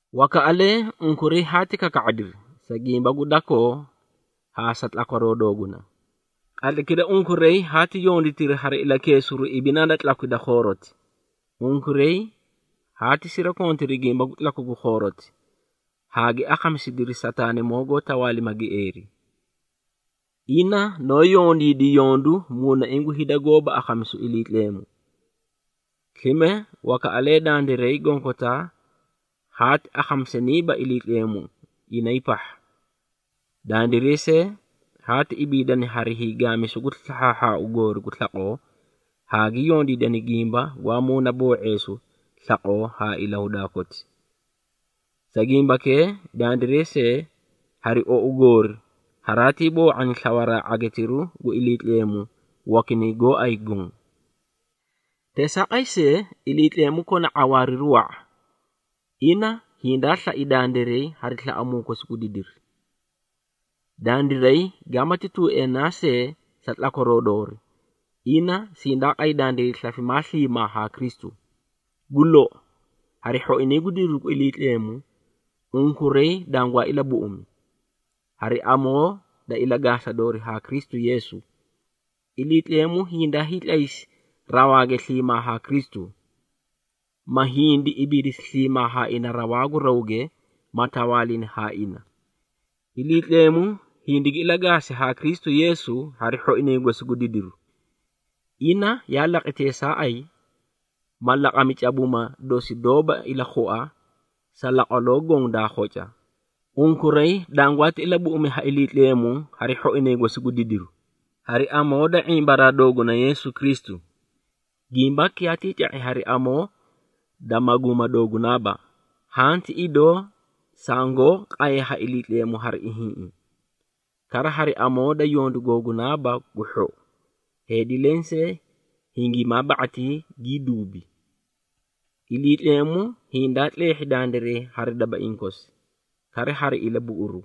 Wakaꞌalee unkuray haati kaka⁄adiri, sa gimba gu dakoo haa sa tlakwaroo dooguna. Qatlaykira unkuray haati yonditiri, hari ilakeesiru ibinaa da tlakwi da khooroti. Unkuray haati sirakontiri gimba gu tlaku gu khooroti haa gi akhamisidiri Sataanimoo goó tawaalima gieeri. Ina noó yondiidi yondu muunaiĩ gu hida goóba akhamisu Iliitleemu. Slime wakaꞌalee dandiray gonkotaa haati akhamisaniiba Iliitleemu inay pahha. Dandiray see, haati ibiidani hari hiigaamisu gu slahhaahhaau goori gu slaqoo haa gi yondiidani gimba gwaa muuna boo⁄eesu slaqoo haa ilahudaa koti. Sa gimbakee, dandiray see hari ou goori haraatii boo⁄ani slawaraa ⁄agitiru gu Iliitleemu, wakinay gooay goõ. Teesaaqay see, Iliitleemu kona ⁄awaariru wa⁄a. Ina hindaa slai dandiray hari slaꞌamuu kosi gu didiri. Dandiray gaamati tuueenaa see sa tlakwaroo doori, ina sindaa qay dandiray slafimaa sliimaa haa Kristu. Gu lou, hari hhoinay gu didiru gu Iliitleemu unkuray dangwaa ilabuꞌumi. Hari amoo da ilagaasa doori haa Kristu Yeesu, Iliitleemu hindaa hiitlaysi rawaage sliimaa haa Kristu, ma hindi ibiidisi sliimaa haa ina rawaa gu rawge, ma tawaalini haa ina. Iliitleemu hindigi ilagaasi haa Kristu Yeesu hari hhoinay gosi gu didiru. Ina yaa laqi teesaaqay, ma laqami cabuuma dosi doóba ilakhua sa laqwaloo goõ daa khoca. Unkuray dangwaati ilabuꞌumi ha Iliitleemu hari hhoinay gosi gu didiru, hari amoo da ⁄imbaraa dooguna Yeesu Kristu. Gimbaki yaatii ca⁄i hari amoo da maguuma doogunaaba, haã ti idoo sangoó qaye ha Iliitleemu hari ihiĩꞌi. Kara, hari amoo da yondu googunaaba gu hhou, heedi lensee hingimaa ba⁄atii gii duubi. Iliitleemu hindaa tleehhi dandiray hari dabaiĩ kosi, kara hari ilabuꞌuru,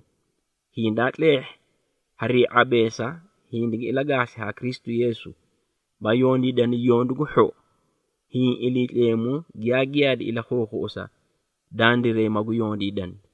hindaa tleehhi harii ⁄abeesa hindigi ilagaasi haa Kristu Yeesu, ma yondiidani yondu gu hhou, hiĩ Iliitleemu giyaa giyaadi ilakhuukhuꞌusa, dandiray magu yondiidani.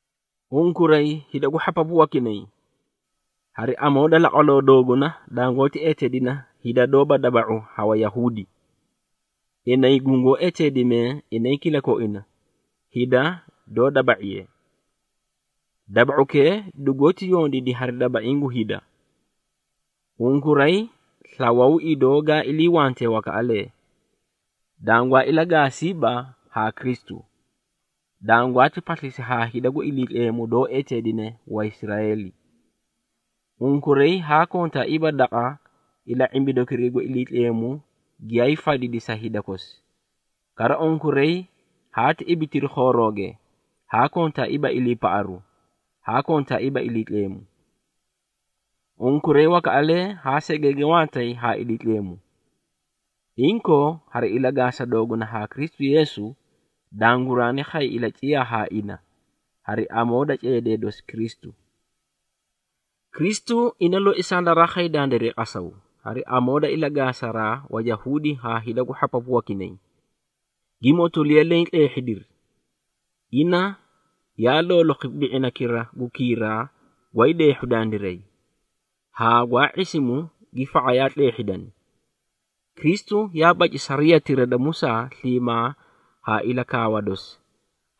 Unkuray hida gu hhapapu wakinay hari amoo da laqwaloo dooguna dangoóti eteedina hida doóba daba⁄u ha Wayahuudi, inay gungoó eteedimee inay kilakoina, hida doó daba⁄iye. Daba⁄ukee dugoóti yondiidi hari dabaiĩ gu hida. Unkuray slawaw idoo gaa iliiwantee wakaꞌalee, dangwaa ilagaasiiba haa Kristu, dangwaati paslisi haa hida gu Iliitleemu doó eteedine Waisraeeli. Unkuray haa kontaaiiba daqa ila⁄imbidukiray gu Iliitleemu giyaay fadidi sa hida kosi. Kara unkuray haati ibitiri khoorooge haa kontaaiiba iliipaꞌaru, haa kontaaiiba Iliitleemu. Unkuray wakaꞌalee haa segenge wantay haa Iliitleemu, inkoo hari ilagaasa dooguna haa Kristu Yeesu, danguraani khay ilaciyaa haa ina, hari amoo da ceedee dosi Kristu. Kristu, ina loi sandaraa khay dandiray qasaw, hari amoo da ilagaasaraa Wayahuudi haa hida gu hhapapu wakinay, gi motoliya leẽ tleehhidiri. Ina yaa loolokhi bi⁄inakira gu kiiraa gwaay deehhu dandiray, haa gwaa ⁄isimu gi fa⁄ayaa tleehhidani. Kristu yaa baci sariyatira da Musaa sliimaa haa ilakaawa dosi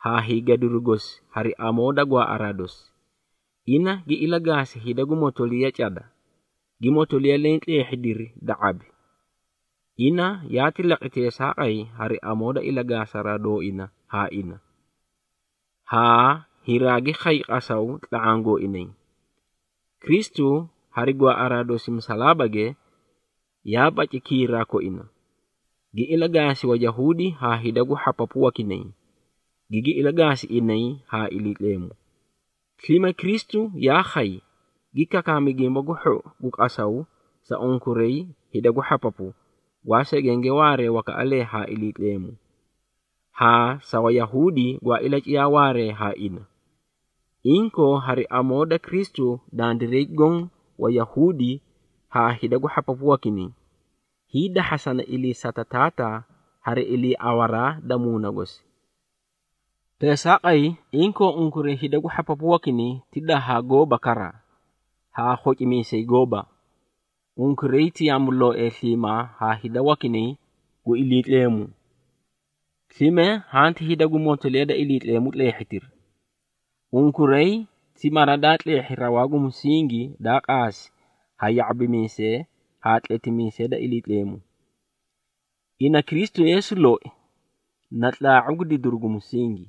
haa hiigadiru gosi hari amoo da gwaaꞌaraa dosi. Ina gi ilagaasi hida gu motoliyati da cada, gi motoliya leẽ tleehhidiri da ⁄abi. Ina yaati laqi teesaaqay, hari amoo da ilagaasa dooina haa ina, haa hiraagi khay qasaw tla⁄aã gooinay. Kristu hari gwaaꞌaraa dosi musalaabage, yaa baci kiiraa koina, gi ilagaasi Wayahuudi haa hida gu hhapapu wakinay, gigi ilagaasi inay haa Iliitleemu. Slime Kristu yaa khay, gi kakaami Gimba gu Hhou gu qasaw sa unkuray hida gu hhapapu, gwaa segenge waaree wakaꞌalee haa Iliitleemu, haa sa Wayahuudi gwaa ilaciyaa waaree haa ina. Inkoo, hari amoo da Kristu dandiray goõ, Wayahuudi haa hida gu hhapapu wakinay, hiidahhasana iliisata Taataa, hari iliiawaraa da Muuna gosi. Teesaaqay, inkoo unkuray hida gu hhapapu wakinay ti dahaa gooba kara, haa khocimiisee gooba. Unkuray ti yaamulooee sliimaa haa hida wakinay gu Iliitleemu, slime hanti hida gu motoliya da Iliitleemu tleehhitiri. Unkuray ti mara daa tleehhi rawaa gu musingi daa qaasi ha ya⁄abimiisee haa tletimiisee da Iliitleemu. Ina Kristu Yeesu loi na tlaa⁄u gu didiru gu musingi.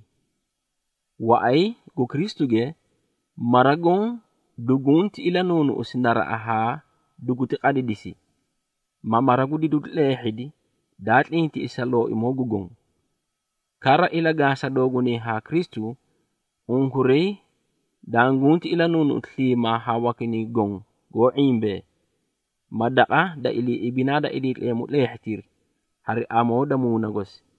Waꞌay gu Kristuge, mara goõ dugunti ilanuunuꞌumisi naraꞌa haa duguti qadidisi, ma mara gu didiru tleehhidi daa tlintiꞌisi sa Looimoo gu Goõ. Kara, ilagaasa doogunay haa Kristu, unkuray danguti ilanuunuꞌusi sliimaa haa wakinay goõ goó ⁄imbee, ma daqa da ilii ibinaa da Iliitleemu tleehhitiri, hari amoo da Muuna gosi.